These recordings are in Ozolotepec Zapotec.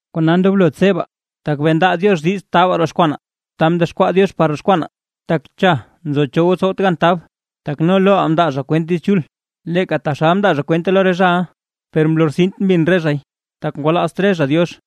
Kona ndoblo tsebaa, tak bee ndaa Diox diiz taabaa roxkwanaa ta mdexkwaa Diox par roxkwanaa, tak cha nzo cho tsowt gan tab. Tak no loʼaa mndaa zha kwent Diiz Chul, leeka taxal mndaa zha kwente lo re zhaʼa; per mlortsint mbin re zhay, tak ngwalaazt re zha Diox.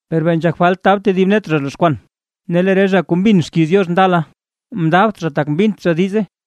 Per bee nzhak falt tab tedib net zha roxkwan, ne lee re zha kuu mbin xkiiz Diox ndala, mndaabt zha tak mbint zha diize;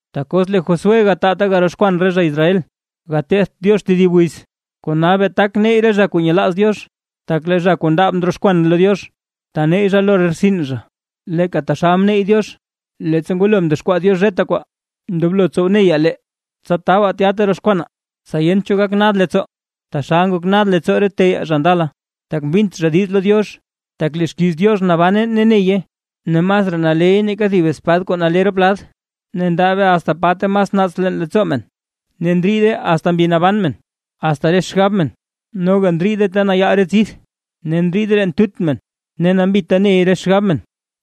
Tak os lee Josué gataa ta garoxkwan re zha Israel, gatetht Diox tedib wiz. Kona bee tak neyy re zha kuu nyelaaz Diox; tak lee zha kuu ndaab ndroxkwan lo Diox, taneyy zha lo re rtsin zha, leeka taxal mneyy Diox, leettsa ngwalo mdexkwaa Diox re kwaa. Ndoblo tsow neyaa lee, tsa tabaa tya ta roxkwanaa, tsa yent cho gak nad leettsoo, taxal ngok nad leettsoo re teyaa zha ndala, tak mbint zha diiz lo Diox. Tak lee xkiiz Diox nabane ne neye, ne masraa naleey nake thib spad kuu nale rop lad, ne ndaabe asta pa mas naats leen leettsoo men, ne ndriide asta mbi naban men, asta xgab men, noga ndriide ta nayaal re tsidth ne ndriide leen tut men. Ne nambita ney re xgab men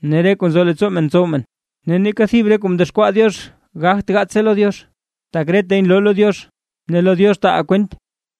ne re kuu nzo leettsoo men tsow men. Ne neeka thib re kuu mdexkwaa Diox gagt gaatse lo Diox; tak retay nloo lo Diox, ne lo Diox taaʼaa kwent.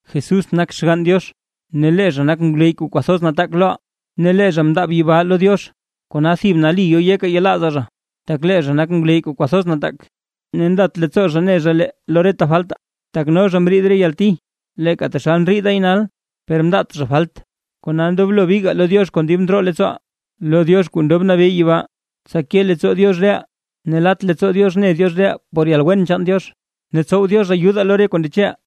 Jesús nak Xgann Diox ne lee zha nak ngwleyy kuu kwathoz nataak loʼaa, ne lee zha mndaab yibaa lo Diox. Kona thib nali yo yeka yelaazaa zha. Tak lee zha nak ngwleyy kuu kwathoz nataak, ne nlat leettsoo zha ne zha lee lo re faltaa; tak no zha mriid re yalti leeka taxal ndriidaay nal, per mndaat zha falt. Kona ndoblo bigaa lo Diox kon dib ndroo leettsooʼaa, lo Diox kuu ndob nabee yibaa, tsa ke leettsoo Diox reʼaa ne lat leettsoo Diox ne Diox reʼaa por yalwen chaan Diox, ne tsow Diox ayudaa lo re kuu ndecheʼaa.